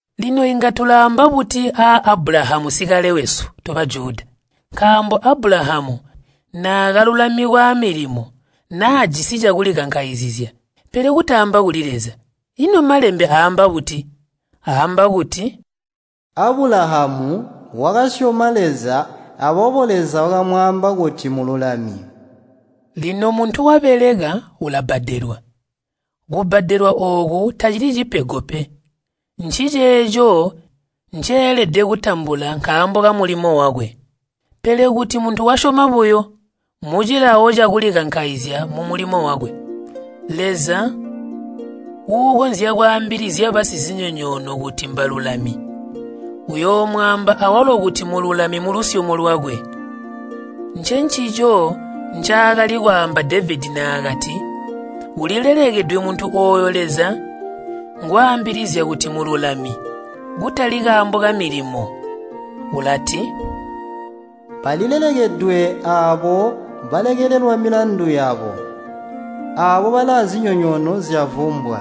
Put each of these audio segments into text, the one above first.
Lino inga tulaamba buti a Abulahamu sikale wesu to Bajuda? Nkaambo Abulahamu naakalulamikwa amilimo, naajisi cakulikankaizizya, pele kutaamba kuli Leza. Ino Malembe aamba buti? Aamba kuti, “Abulahamu wakasyoma Leza, aboobo Leza wakamwaamba kuti mululami.” Lino muntu wabeleka, ulabbadelwa, kubbadelwa ooku tacili cipego pe, nciceeco nceelede kutambula nkaambo kamulimo wakwe. Pele kuti muntu wasyoma buyo, mucilawo cakulikankaizya mumulimo wakwe, Leza uukonzya kwaambilizya basizinyonyoono kuti mbalulami, uyoomwaamba awalo kuti mululami mulusyomo lwakwe. Ncencico ncaakali kwaamba Devedi naakati ulilelekedwe muntu ooyo Leza ngwaambilizya kuti mmululami, kutali kaambo kamilimo. Ulati, “Balilelekedwe aabo balekelelwa milandu yabo, aabo bali aazinyonyoono zyavumbwa.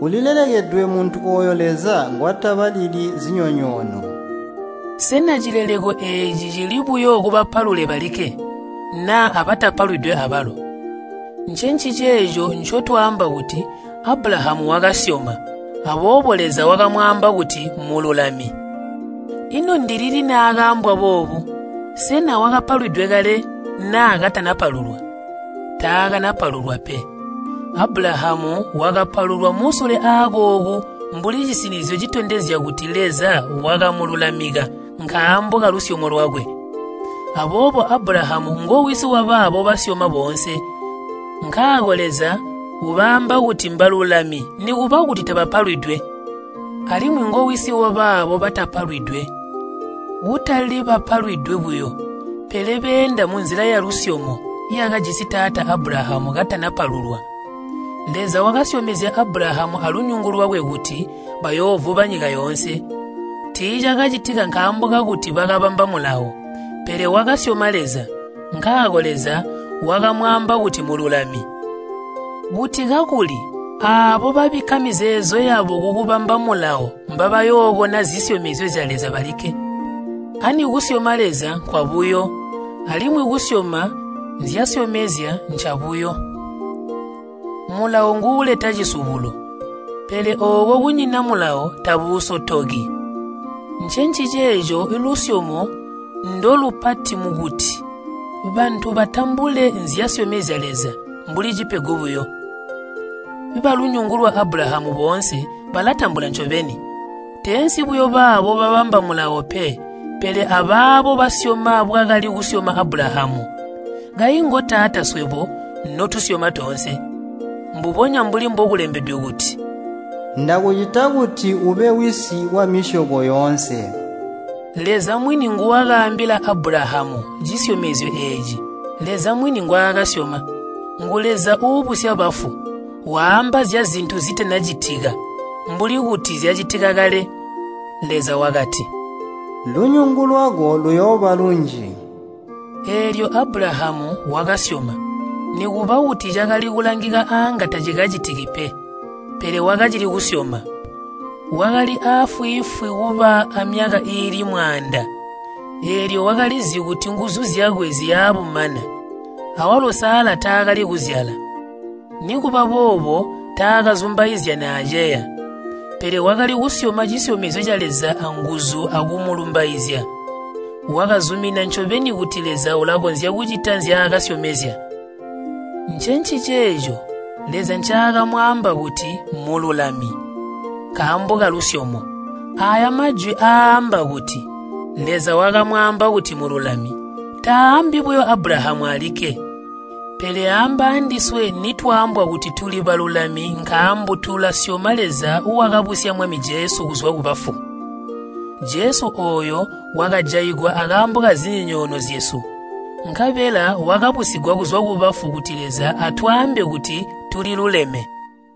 Ulilelekedwe muntu ooyo Leza ngwatabalili zinyonyoono.” Sena cileleko eeci cili buyo kubapalule balikke, naa abatapalwidwe abalo? Ncenciceeco ncotwaamba kuti Abulahamu wakasyoma, aboobo Leza wakamwaamba kuti mmululami. Ino ndilili naakaambwa boobo? Sena wakapalwidwe kale naa katanapalulwa? Taakanapalulwa pe. Abulahamu wakapalulwa musule aakooku mbuli cisinizyo citondezya kuti Leza wakamululamika nkaambo kalusyomo lwakwe. Aboobo Abulahamu ngowisi wabaabo basyoma boonse, nkaako Leza ubaamba kuti mbalulami nikuba kuti tabapalwidwe. Alimwi ngowisi wabaabo batapalwidwe. Kutali bapalwidwe buyo, pele beenda munzila yalusyomo yakajisi taata Abulahamu katana palulwa Leza wakasyomezya Abulahamu alunyungu lwakwe kuti bayoovuba nyika yoonse. Tiicakacitika nkaambo kakuti wakabamba Mulawo, pele wakasyoma Leza, nkaako Leza wakamwaamba kuti mululami. Kuti kakuli aabo babikka mizeezo yabo kukubamba Mulawo mbabayookona zisyomezya zya Leza balikke, ani kusyoma Leza nkwabuyo, alimwi kusyoma nzyasyomezya ncabuyo. Mulawo nguuleta cisubulo, pele ooko kunyina Mulawo tabuusotoki. Ncenciceeco lusyomo ndolupati mukuti bantu batambule nzyasyomezya Leza mbuli cipego buyo. Balunyungu lwa Abulahamu boonse balatambula ncobeni, teensi buyo baabo babamba Mulawo pe, pele abaabo basyoma bwakali kusyoma Abulahamu. Kayi ngotaata swebo notusyoma toonse. Mbubonya mbuli mbokulembedwe kuti, “Ndakucita kuti ube wisi wamisyobo yoonse.” Leza mwini nguwakaambila Abulahamu cisyomezyo eeci, Leza mwini ngwaakasyoma. Ngu Leza uubusya bafu, waamba zyazintu zitanacitika mbuli kuti zyacitika kale. Leza wakati, “Lunyungu lwako luyooba lunji.” Eelyo Abulahamu wakasyoma, nikuba kuti cakali kulangika aanga tacikacitiki pe, pele wakacili kusyoma. Wakali aafwiifwi kuba amyaka iili mwaanda, eelyo wakalizi kuti nguzu zyakwe ziya bumana, awalo Sala taakali kuzyala. Nikuba boobo taakazumbauzya naaceya. Pele wakali kusyoma cisyomezyo ca Leza anguzu akumulumbaizya. Wakazumina ncobeni kuti Leza ulakonzya kucita nzyaakasyomezya. Ncenciceeco “Leza ncaakamwaamba kuti mululami” nkaambo kalusyomo. Aaya majwi aaamba kuti, “Leza wakamwaamba kuti mululami,” taaambi buyo Abulahamu alikke. Pele aamba andiswe nitwaambwa kuti tuli balulami nkaambo tulasyoma Leza wakabusya Mwami Jesu kuzwa kubafu. Jesu ooyo wakajaigwa akaambo kazinyonyoono zyesu, nkabela wakabusigwa kuzwa kubafu kuti Leza atwaambe kuti tuliluleme.